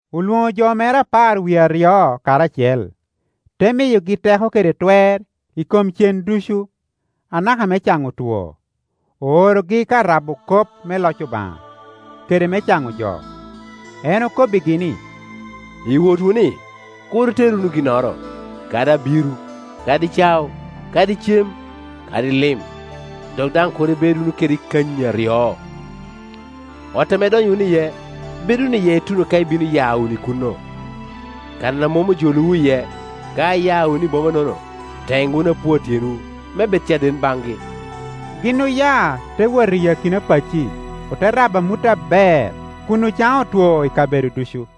Olwoŋo jo mere apar wie aryo karacel, te miyogi teko kede twer i kom cen ducu, anaka me caŋo two, oorogi ka rabo kop me loc Obaŋa, kede me caŋo jo. En okobbigi ni, “I wotwu-ni, kur iter wunu ginnoro, kadi abiro, kadi cao, kadi cem, kadi lim; dok daŋ kur ibed wunu kede kanyi aryo. Ot ame idonyo wunu iye, bed wunu iye ituno ka ibino ya wunu i kuno. Kan a mom ojolowu iye, ka iya wunu i boma-nono, ten wunu apua tyenwu me bed caden baŋgi.” Gin oya te wot i akina pacci, ote rabo amut aber, kun ocaŋo otwo i kabedo ducu.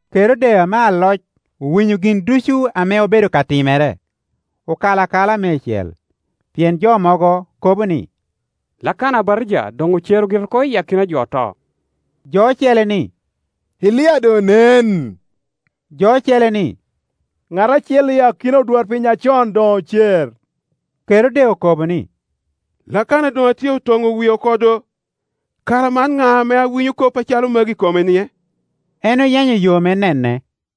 Kerode ame aloc owinyo gin ducu ame obedo ka timere, okalo akala meicel, pien jo mogo kobo ni, “Lakana Abatija doŋ ocero gire oko iyi akina jo oto.” Jo ocele ni, “Elia doŋ onen”; jo ocele ni, “Ŋat acel i akina odwarpiny acon doŋ ocer.” Kerode okobo ni, “Lakana doŋ atyeko toŋo wie oko do; kara man ŋa ame awinyo kop acalo magi i komenie?” En oyenyo yo me nene.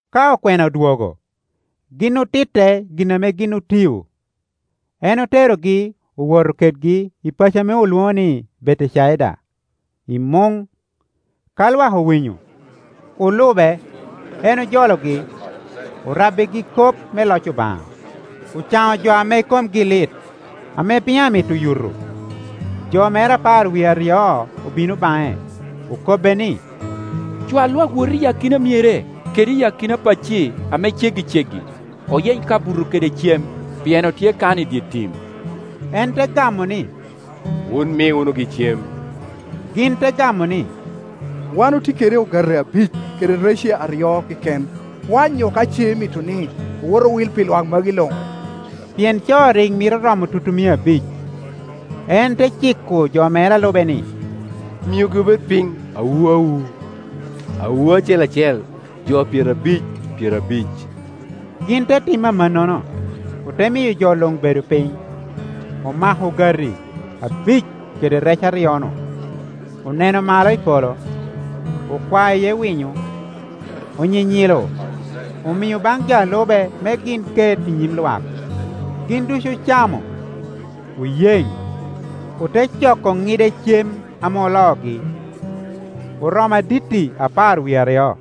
Ka okwena odwogo, gin otitte gin ame gin otio. En oterogi owoto kedgi i paco ame olwoŋo ni Betecaida, i muŋ. Ka lwak owinyo, olube; en ojologi, orabbigi kop me loc Obaŋa, ocaŋo jo ame komgi lit. Ame piny amito yuto, jo mere apar wie aryo obino baŋe, okobbe ni, “Cwa lwak wot i akina myere kede i akina pacci ame ceggiceggi, oyeny kabuto kede cem; pien otye kan i dye tim.” En te gamo ni, “Wun mi wunugi cem.” Gin te gamo ni, “Wan otye kede ogati abic kede rece aryo keken, kwanyo ka ce imito ni owot owil pi lwak magi luŋ.” Pien co rik mito romo tutumia abic. En te ciko jo mere a lube ni, “Miugi obed piny awu awu, awu acel acel jo pyerabic pyerabic.” Gin te timo amannono, ote miyo jo luŋ bedo piny. Omako ogati abic kede rece aryo-nu, oneno malo i polo, okwao iye winyo, onyinyilo omio baŋ jo a lube me gin ket i nyim lwak. Gin ducu ocamo, oyeŋ. Ote coko ŋide cem ame oloogi, oromo aditti apar wie aryo.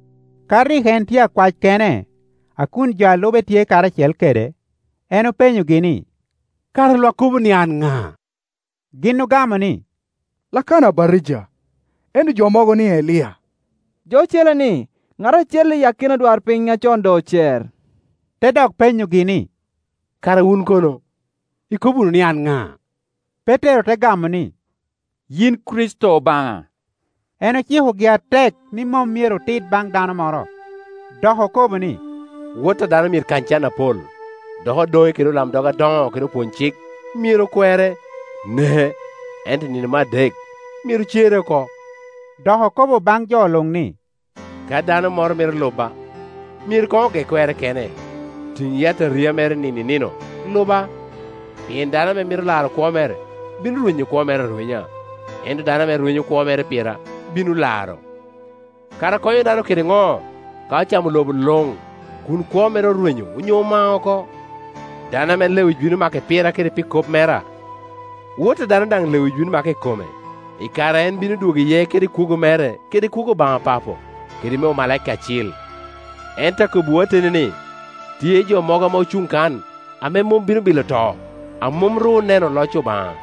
Ka rik en tye akwac kene, a kun jo a lube tye karacel kede, en openyogi ni, “Kara lwak kobo ni an ŋa?” Gin ogamo ni, “Lakana Abatija; ento jo mogo ni, Elia; jo ocele ni, ‘ŋat acel i akina odwarpiny acon doŋ ocer.’” Te dok penyogi ni, “Kara wun kono, ikobo wunu ni an ŋa?” Petero te gamo ni, “Yin Kricito Obaŋa.” En ocikogi atek ni mom myero otit baŋ dano moro. Dok okobo ni, “Wot a dano myero kany can apol, dok odoŋe kede olamdog adoŋo kede opwony-cik myero kwere, neke, ento i nino me adek myero cere oko,” Dok okobo baŋ jo luŋ ni, “Ka dano moro mito luba, myero koŋ oge kwerre kene, tiŋ yataria mere nino i nino, luba. Pien dano ame mito laro kwo mere, bino rwenyo kwo mere arwenya, ento dano ame rwenyo kwo mere pira, bino laro. Kara konyo dano kede ŋo ka ocamo lobo luŋ, kun kwo mere orwenyo onyo omao oko? Dano ame lewic bino make pira kede pi kop mera, Wot a dano daŋ lewic bino make i kome i kare a en bino dwogo iye kede kwogo mere, kede kwogo Obaŋa Papo kede me omalaika acil. Ento akobbiwu ateni ni, tye jo mogo ame ocuŋ kan ame mom bino bilo to, a mom ru oneno loc Obaŋa.”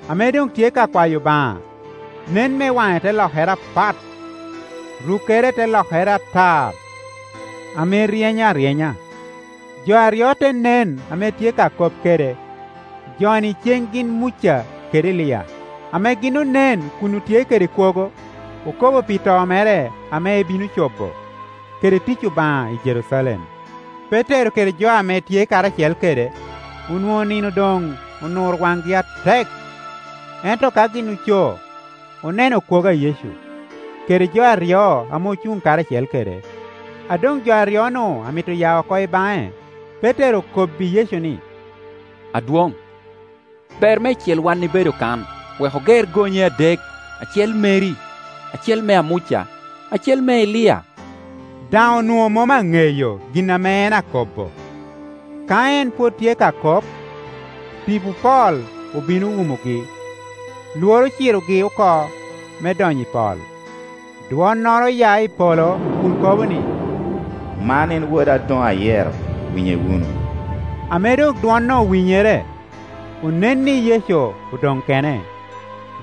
Ame doŋ tye ka kwayo Obaŋa, nen me waŋe te lokere apat, rukkere te lokere atar ame ryeny aryenya. Jo aryo te nen ame tye ka kop kede; jo-ni ceŋ gin Muca kede Elia, ame gin onen kun otye kede kwogo, okobo pi to mere ame ebino cobo kede tic Obaŋa i Jerucalem. Petero kede jo ame tye karacel kede onwoŋo nino doŋ onuro waŋgi atek, ento ka gin oco, oneno kwogo a Yecu, kede jo aryo ame ocuŋ karacel kede. A doŋ jo aryo-nu amito ya oko i baŋe, Petero okobbi Yecu ni, “Adwoŋ, ber meicel wan ibedo kano Wek oger gonye adek, acel meri, acel mea Muca, acel mea Elia,” daŋ onwoŋo mom aŋeyo gin ame en akobbo. Ka en pwod tye ka kop, tipo pol obino owumogi, lworo ocirogi oko me donyo i pol. Dwonnoro oya i polo kun kobo ni, “Man en Woda a doŋ ayero; winye wunu.” Ame doŋ dwon-nu owinyere, onen ni Yecu odoŋ kene.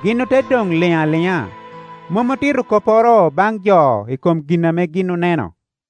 Gin ote doŋ liŋ aliŋa, mom otito kopporo baŋ jo i kom gin ame gin oneno.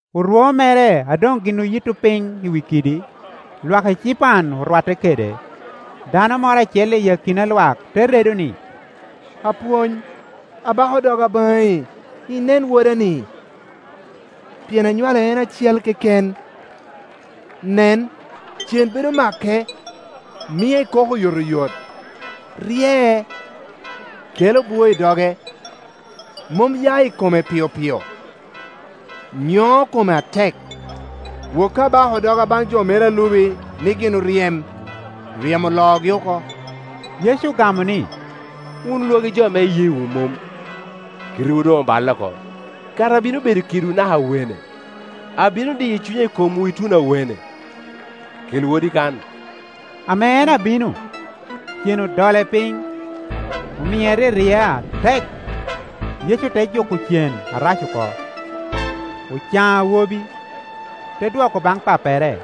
Orwo mere a doŋ gin oyitto piny i wi kidi, lwak ecipan orwatte kede. Dano moro acel i akina lwak te redo ni, “Apwony, abako doga baŋi inen woda-ni, pien anywale en acel keken. Nen, cen bedo make, mie kok oyotoyot; ryee, kelo bwoo i doge, mom ya i kome piopio, nyoŋo kome atek. Woki abako doga baŋ jo meri a lubi ni gin oryem, ryemo oloogi oko.” Yecu ogamo ni, “Wun lwagi jo ame iyeewu mom, kitewu doŋ oballe oko; kara abino bedo kedwu naka awene? Abino diyo cunya i komwu ituno awene? Kel wodi kan.” Ame en abino, cen odole piny, omie oryeryea atek. Yecu te juko cen arac oko, ocaŋo awobi, te dwoko baŋ pappere.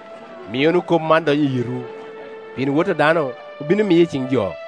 “Mi wunu kop man dony i yitwu; pien Wot a dano obino miye i ciŋ jo.”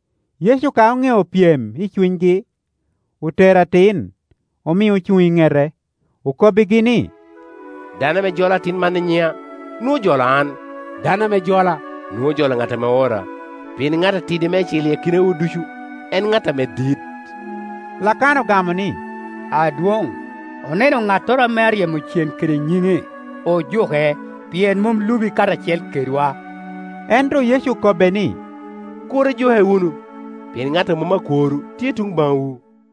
Yecu ka oŋeo pyem i cunygi, otero atin, omio ocuŋ i ŋete, okobbigi ni, “Dano ame jolo atin man i nyiŋa, nwoŋo ojolo an; dano ame jola, nwoŋo ojolo ŋat ame oora; pien ŋat ame tidi meicel i akinawu ducu, en ŋat ame dit.” Lakana ogamo ni, “Adwoŋ, oneno ŋattoro ame aryemo cen kede nyiŋi, ojuke, pien mom lubi karacel kedwa.” Ento Yecu okobbe ni, “Kur ijuke wunu, pien ŋat a mom akworwu tye tuŋ baŋwu.”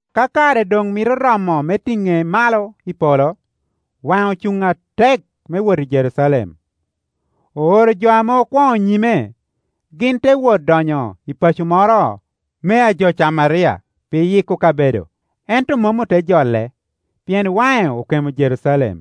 Ka kare doŋ mito romo me tiŋe malo i polo, waŋe ocuŋ atek me wot i Jerucalem. Ooro jo ame okwoŋo nyime; gin te wot donyo i paco moro mea jo Camaria pi yikke kabedo. Ento mom ote jole, pien waŋe okemo tuŋ Jerucalem.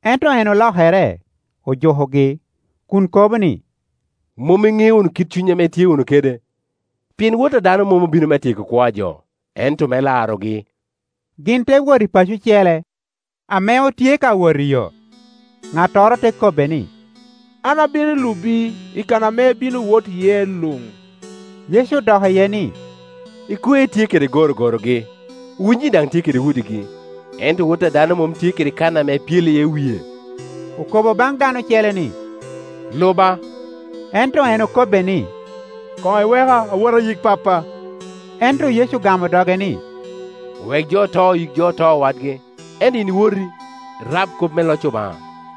Ento en olokere, ojukogi [kun kobo ni, “Mom iŋeo wunu kit cuny ame itye wunu kede; pien Wot a dano mom obino me tyeko kwo a jo, ento me larogi.”] Gin te wot i paco ocele. Ame otye ka wot iyo, ŋattoro te kobbe ni, “An abino lubi i kan ame ibino wot iye luŋ.” Yecu odok iye ni, “Ekwe tye kede gorogorogi, winyi daŋ tye kede udigi, ento Wot a dano mom tye kede kan ame epyelo iye wie.” Okobo baŋ dano ocele ni, “Luba,” Ento en okobbe ni, “Koŋ iweka awot ayik pappa.” Ento Yecu ogamo doge ni, “Wek jo oto yik jo oto wadgi, ento yin woti, irab kop me loc Obaŋa.”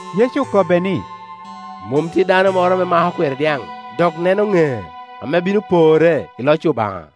Yecu okobbe ni, “Mom tye dano moro ame mako kweri dyaŋ, dok neno ŋec, ame bino porre i loc Obaŋa.”